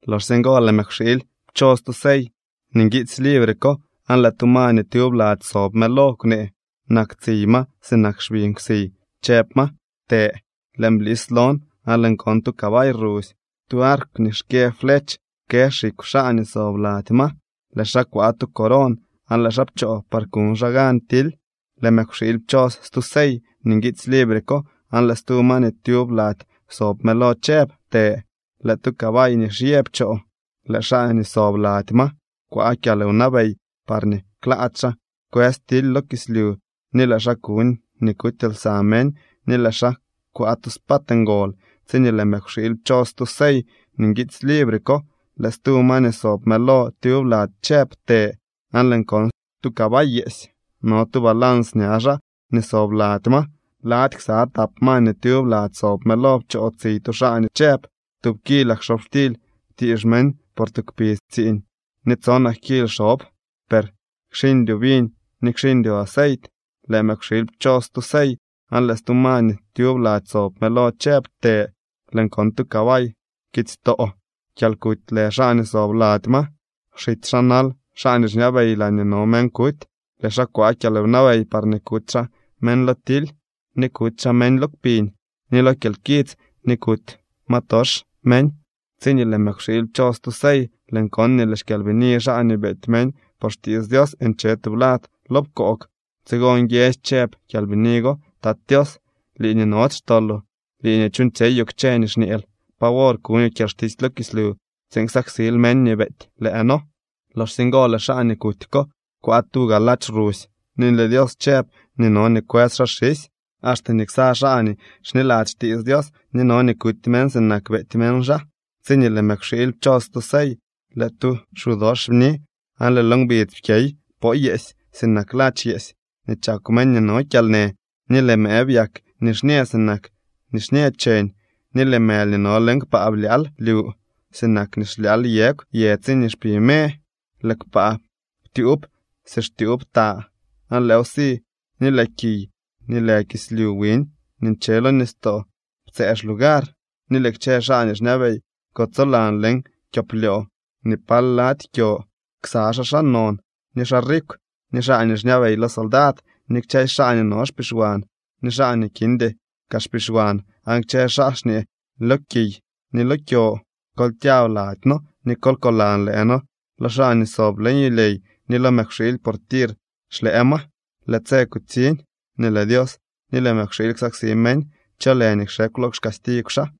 Loxsye ngo lëë mëkwxiily pchos tu sey nii nguiitsy libre ko aan lëë tu ma nii tyub lady sob mëlo kwnee. Nak tsiy ma sinak xbi nkwsiy, chëb ma: —¡Të! Lëën blis lon aan lëën kon tu cabay rusy. Tu arkw nii xkyë flech kë xikw xaa nii sob lady ma. Lëë xaa kwaa tu coron aan lëë xaa pchoo par kuñ xaa gan tily. Lëë mëkwxiily pchos stu sey nii nguitsy libre ko aan lëë stu ma nii tyub lady sob mëlo chëb: —¡Të! Lëë tu cabay nixñë pchoo. Lëë xaa nii sob lady ma kwaa kyalwnabey parñee klaady xaa kwës tily lo kislyu ni lëë xaa kuñ nii kuty lsa meñ, ni lëë xaa kwaa tu spad ngol. Tsiñee lëë mëkwxiily pchos stu sey nii nguitsy libre ko, lëë stu ma nii sob mëlo tyub lady chëb: —¡Të! Aan lëën kon tu cabay yeesy. No tu balans ña xaa nii sob lady ma. Lady ksa tap ma nii tyub lady sob mëlo pchoo tsiy tu xaa nii chëb: —Tub kilak xobxtily kwtiix meñ por tu kpidz tsiiñ ni tsonak kil xob, per kxiñdyoo viñ ni kxiñdyoo aceit. Lëë mëkwxiily pchos stu sey aan lëë stu ma nii tyub lady sob mëlo chëb: —¡Të! Lëën kon tu cabay pkitsytoo. Kyalkuty lë xaa nii sob lady ma, xitsy xaa nal xaa nii xñabey laañee no meñ kuty. Lëë xaa kwaa kyalwnabey parñee kuty xaa meñ lo tily, ni kuty xaa meñ lo kpiñ, ni lo kyalkits ni kuty ma tox meñ. Tsiñee lëë mëkwxiily pchos stu sey, lëën kon nii lëë xkyalbini xaa nii beety meñ por xtiits Dios nche tublad lo pkoog. Tsigo nguiedzy chëb kyalbini go: —Tat Tios, lii nii nody xtoloo ni lii nii chuuñtsyeyoo kchë nii xñeel, ¿pa wor kuñoo kyalxtisy lo kislyu tsiin ksaksil meñ nii beety lëë noo? Loxsye ngo lëë xaa nii kuty ko kwaa tuga ladx rusy ni lëë Dios chëb nii no nii kwës xaa xisy, axte nii ksa xaa nii xniladzy xtiits Dios nii no nii kuty meñ sinak beety meñ xaa. Tsiñee lëë mëkwxiily pchos stu sey, lëë tu xu dox bni aan lëë lo ngbidz pkyey poo yeesy sinak ladx yeesy nii chakw meñ nii no kyalnë, ni lëë mëë byak nixñë sinak nixñë cheñ, ni lëë mëly nii no leñ kpaa blyaal lyu sinak nii xlyaal yegw yë tsiñee xpi me. Lëë kpaa ptyuub si xtyuub ta aan lëëw si ni lëë kiy ni lëë kislyu wiñ nii nche lo nistoo ptsëë xlugar. Ni lëë kchë xaa nii xñabey kutsolan leñ kyoplyoo ni pal lady kyo, ksa xaa xaa non, ni xaa rikw, ni xaa nii xñabey lo soldad, ni kchësy xaa nii no xpixwan ni xaa nii kindy kaa xpixwan. Aan kchë xaa xñee lo kiy ni lo kyo: —Kol kyab lady noo nikol koolaan lëë noo lo xaa nii sob leñ yulyey ni lo mëkwxiily, por tir xlëë ma. Lëë tse kutsiñ nii lëë Dios ni lëë mëkwxiily ksaksi meñ. ¿Cho lë nii kxekw lo xcastigw xaa?